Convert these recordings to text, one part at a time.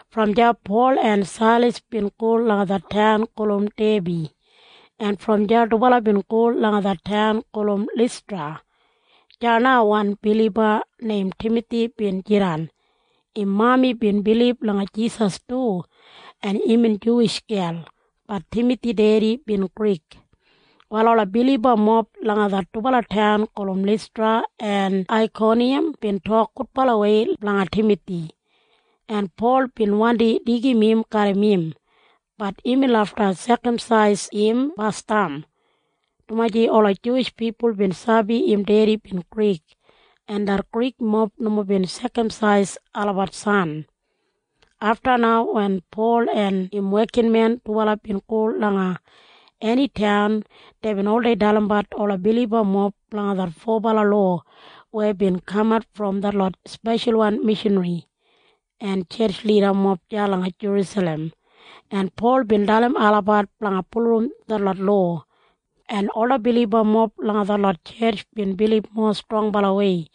Brom deya Pol en Sailas bin go langa det taun gulum Debi, en brom deya dubala bin go langa det taun gulum Listra. Deya na wan biliba neim Timathi bin jidan. Im mami bin bilib langa Jisas du, en imbin Juwish gel. Bat Timathi dedi bin Grik. Wal ola bilibamob langa det dubala taun gulum Listra en Aikoniyam bin tok gudbalawei blanga Timathi, en Pol bin wandi deigim im garram im. Bat imbin lafta sekamsais im basdam, dumaji ola Juwish pipul bin sabi im dedi bin Grik, en det Grikmob nomo bin sekamsais olabat san. Afta na wen Pol en im wekinmen dubala bin go langa eni taun, deibin oldei dalimbat ola bilibamob blanga det fobala lowa weya bin kamat brom detlot speshalwan mishanri en tjetj lidamob deya langa Jerusalem, en Pol bin dalim olabat blanga bulurrum detlot lowa, en ola bilibamob langa detlot tjetj bin bilib mowa strongbalawei,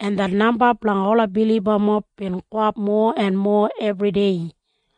en det namba blanga ola bilibamob bin gowap mowa en mowa ebridei.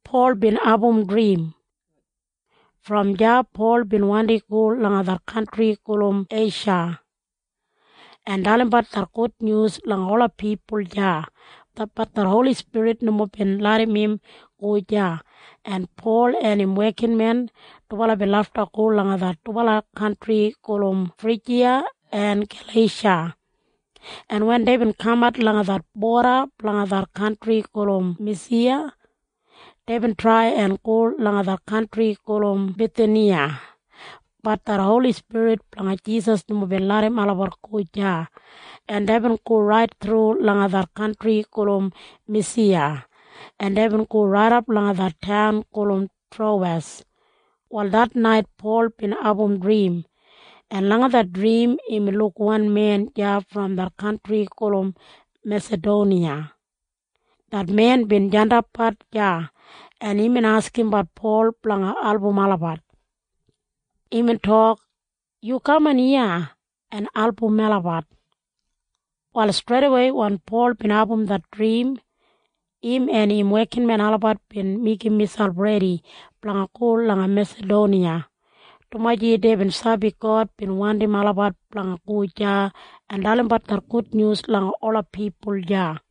Brom deya Pol bin wandi go langa det kantri gulum Eisha, en dalimbat det gudnyus langa ola pipul deya. Bat det Holi Spirit nomo bin larram im go deya, en Pol en im wekinmen dubala bin lafta go langa det dubala kantri gulum Frijiya en Galeisha, en wen deibin kamat langa det boda blanga det kantri gulum Misiya, deibin trai en go langa det kantri gulum Bithiniya. Bat det Holi Spirit blanga Jisas nomo bin larram olabat go deya, en deibin go rait thru langa det kantri gulum Misiya, en deibin go raidap langa det taun gulum Trowes. Wal det nait Pol bin abum drim, en langa det drim imbin luk wan men deya brom det kantri gulum Mesadoniya. Det men bin jandapbat deya, en imbin askimbat Pol blanga album olabat. Imbin tok, “Yu kaman iya en album melabat.” Wal streidawei wen Pol bin abum det drim, im en im wekinmen olabat bin meigim miselp redi blanga go langa Mesadoniya, dumaji deibin sabi God bin wandim olabat blanga go deya en dalimbat det gudnyus langa ola pipul deya.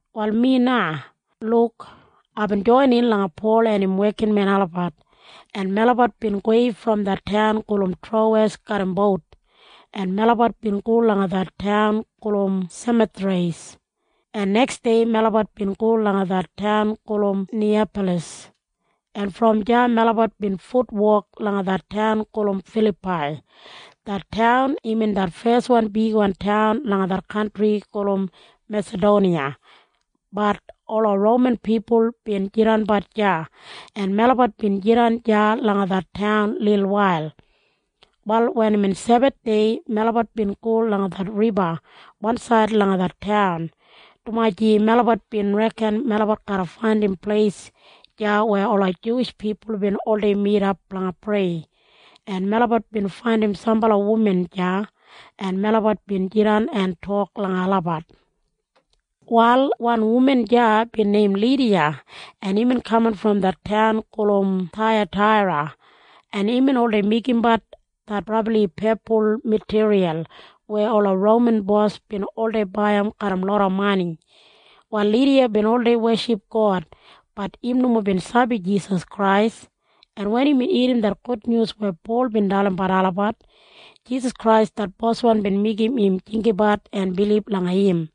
Wal mi na, Luk, aibin joinin langa Pol en im wekinmen olabat, en melabat bin gowei brom det taun gulum Trowes garram bout, en melabat bin go langa det ailin gulum Semothreis, en neksdei melabat bin go langa det taun gulum Niyapalas, en brom deya melabat bin futwok langa det taun gulum Filapai. Det taun imbin det feswan bigwan taun langa det kantri gulum Mesadoniya. Bat ola Roman pipul bin jidanbat deya, en melabat bin jidan deya langa det taun lilwail. Wal wen imbin Sebathdei, melabat bin go langa det riba wansaid langa det taun, dumaji melabat bin reken melabat garra faindim pleis deya weya ola Juwish pipul bin oldei midap blanga prei, en melabat bin faindim sambala wuman deya, en melabat bin jidan en tok langa olabat. Wal wan wuman deya bin neim Lidiya. Imbin kaman brom det taun gulum Thaiyataira, en imbin oldei meigimbat det brabli pepul matiriyal weya ola Roman bos bin oldei baiyim garram loda mani. Wal Lidiya bin oldei weship God. Bat im nomo bin sabi Jisas Krais, en wen imbin irrim det gudnyus weya Pol bin dalimbat olabat, Jisas Krais det Boswan bin meigim im jinggabat en bilib langa im.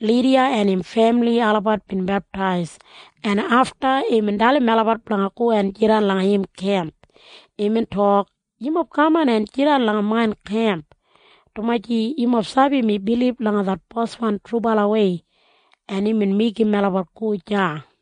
Lidiya en im femili olabat bin beptais, en afta imbin dalim melabat blanga go en jidan langa im kemp. Imbin tok, “Yumob kaman en jidan langa main kemp, dumaji yumob sabi mi bilib langa det Boswan trubalawei.” En imbin meigim melabat go deya.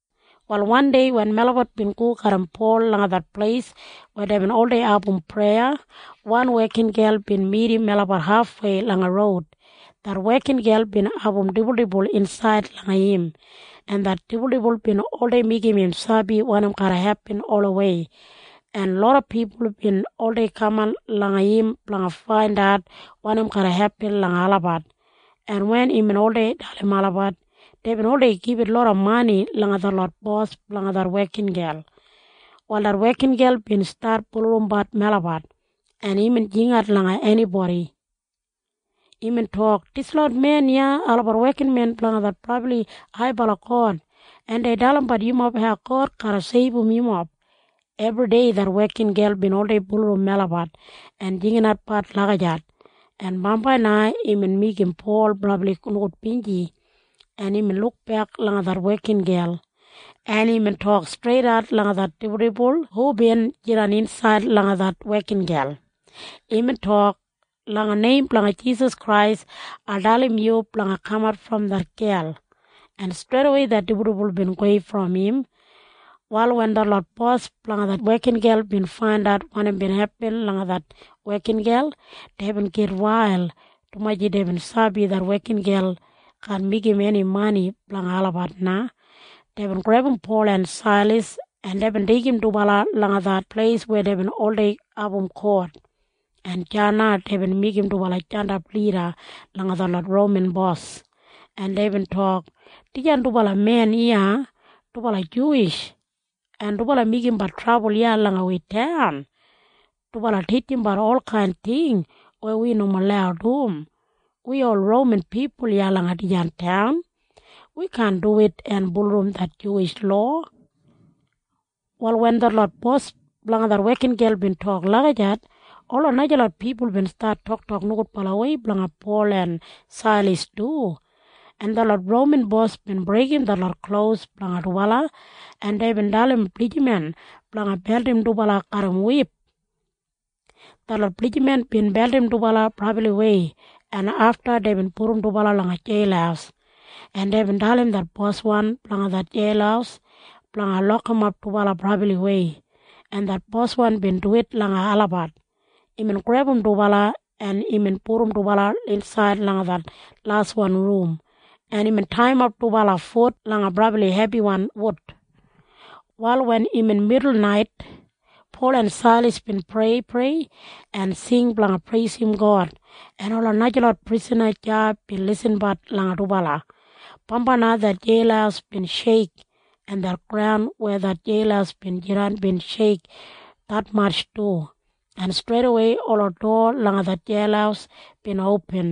Wal wandei wen melabat bin go garram Pol langa det pleis weya deibin oldei abum preya, wan wekingel bin midim melabat hafwei langa roud. Det wekingel bin abum dibuldibul insaid langa im, en det dibuldibul bin oldei meigim im sabi wanim garra hepin olawei, en loda pipul bin oldei kaman langa im blanga faindat wanim garra hepin langa olabat, en wen imbin oldei dalim olabat, deibin oldei gibit loda mani langa detlot bos blanga det wekingel. Wal det wekingel bin stat bulurrumbat melabat, en imbin jingat langa enibodi. Imbin tok, “Dislot men iya olabat wekinmen blanga det brabli haibala God, en dei dalimbat yumob hau God garra seibum yumob!” Ebridei det wekingel bin oldei bulurrum melabat en jinginatbat lagijat, en bambai na imbin meigim Pol brabli nogudbinji, en imbin lukbek langa det wekingel, en imbin tok streidat langa det dibuldibul hubin jidan insaid langa det wekingel. Imbin tok, “Langa neim blanga Jisas Krais, ai dalim yu blanga kamat brom det gel!” En streidawei det dibuldibul bin gowei brom im. Wal wen detlot bos blanga det wekingel bin faindat wanim bin hepin langa det wekingel, deibin gitwail, dumaji deibin sabi det wekingel kaan meigim eni mani blanga olabat na. Deibin grebum Pol en Sailas, en deibin deigim dubala langa det pleis weya deibin oldei abum kot. En deya na deibin meigim dubala jandap lida langa detlot Roman bos, en deibin tok, “Dijan dubala men iya, dubala Juwish, en dubala meigimbat trabul iya langa wi taun. Dubala titjimbat olkain ting weya wi nomo lau dum. Wi ol Roman pipul iya langa dijan taun, wi kaan duwit en bulurrum det Juwish lowa.” Wal wen detlot bos blanga det wekingel bin tok lagijat, ola najalot pipul bin stat toktok nogudbalawei blanga Pol en Sailas du, en detlot Roman bos bin breigim detlot klos blanga dubala, en deibin dalim blijiman blanga beldim dubala garram wip. Detlot blijiman bin beldim dubala brabliwei, en afta deibin pudum dubala langa jeil, en deibin dalim det boswan blanga det jeil blanga lokimap dubala brabliwei, en det boswan bin duwit langa olabat. Imbin grebum dubala, en imbin pudum dubala rait insaid langa det insaidwan rum, en imbin taiyimap dubala fut langa brabli hebiwan wud. Wal wen imbin midulnait, Pol en Sailas bin preiprei en singsing blanga preisim God, en ola najalot prisana deya bin lisinbat langa dubala. Bambai na det jeil bin sheik, en det graun weya det jeil bin jidan bin sheik detmatj du, en streidawei ola dowa langa det jeil bin opin,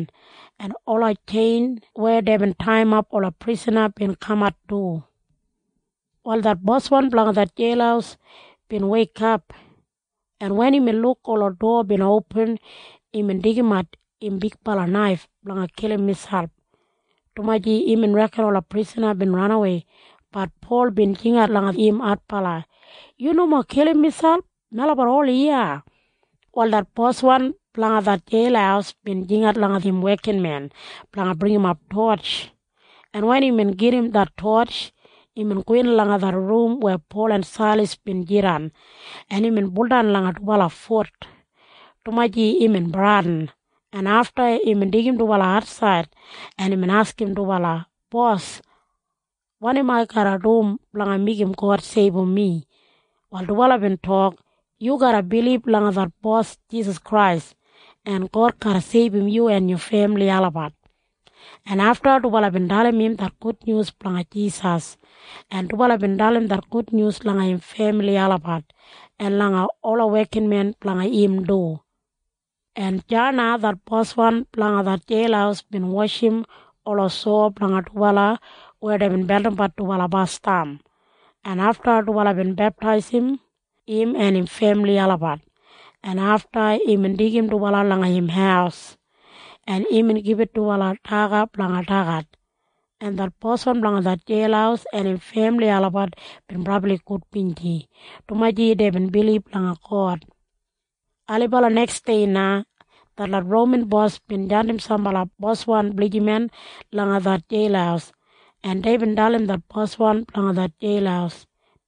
en ola tjein weya deibin taiyimap ola prisana bin kamat du. Wal det boswan blanga det jeil bin weikap, en wen imbin luk ola dowa bin opin, imbin deigimat im bigbala naif blanga kilim miselp, dumaji imbin reken ola prisana bin ranawei. Bat Pol bin jingat langa im adbala, “Yu nomo kilim miselp! Melabat ol iya!” Wal det boswan blanga det jeil bin jingat langa im wekinmen blanga bringimap totj, en wen imbin gedim det totj, imbin gowin langa det rum weya Pol en Sailas bin jidan. En imbin buldan langa dubala fut, dumaji imbin bradin, en afta imbin deigim dubala atsaid, en imbin askim dubala, “Bos, wanim ai garra dum blanga meigim God seibum mi?” Wal dubala bin tok, “Yu garra bilib langa det Bos Jisas Krais, en God garra seibum yu en yu femili olabat.” En afta dubala bin dalim im det gudnyus blanga Jisas, en dubala bin dalim det gudnyus langa im femili olabat en langa ola wekinmen blanga im du. En deya na det boswan blanga det jeil bin washim ola sowa blanga dubala weya deibin beldimbat dubala basdam, en afta dubala bin beptaisim im en im femili olabat, en afta imbin deigim dubala langa im haus, en imbin gibit dubala daga blanga dagat, en det boswan blanga det jeil en im femili olabat bin brabli gudbinji, dumaji deibin bilib langa God. Ailibala neksdei na detlot Roman bos bin jandim sambala boswan blijiman langa det jeil, en deibin dalim det boswan blanga det jeil.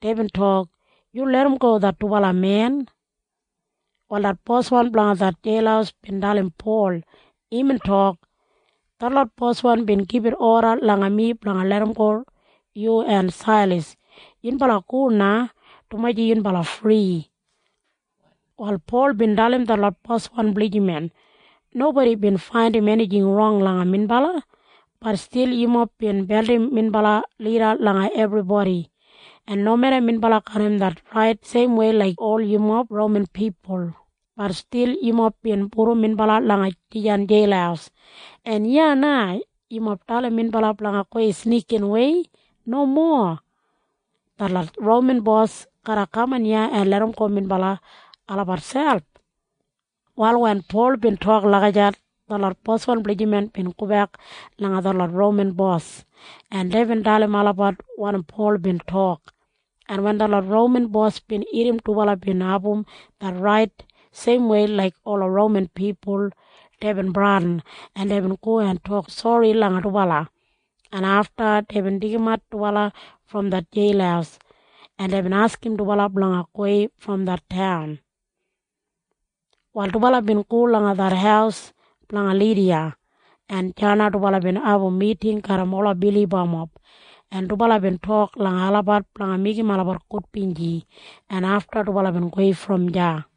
Deibin tok, “Yu larramgo det dubala men.” Wal det boswan blanga det jeil bin dalim Pol. Imbin tok, “Detlot boswan bin gibit oda langa mi blanga larramgo yu en Sailas. Yunbala go na, dumaji yunbala fri.” Wal Pol bin dalim detlot boswan blijiman, “Nobodi bin faindim enijing rong langa minbala. Bat stil yumob bin beldim minbala lida langa ebribodi. En nomeda minbala Roman jis laik yumob, bat stil yumob bin pudum minbala langa dijan jeil. Yumob bin breigim det Roman lowa. En iya na yumob dalim minbala blanga gowei snikinwei? Nomo! Detlot Roman bos garra kaman iya en larramgo minbala fri olabat selp.” Wal wen Pol bin tok lagijat, detlot boswan blijiman bin gobek langa detlot Roman bos, en deibin dalim olabat wanim Pol bin tok, en wen detlot Roman bos bin irrim dubala bin abum det rait, seimwei laik ola Roman pipul, deibin bradin, en deibin go en tok sori langa dubala, en afta deibin deigimat dubala brom det jeil, en deibin askim dubala blanga gowei brom det taun. Wal dubala bin go langa det haus blanga Lidiya, en deya na dubala bin abum miting garram ola bilibamob, en dubala bin tok langa olabat blanga meigim olabat gudbinji, en afta dubala bin gowei brom deya.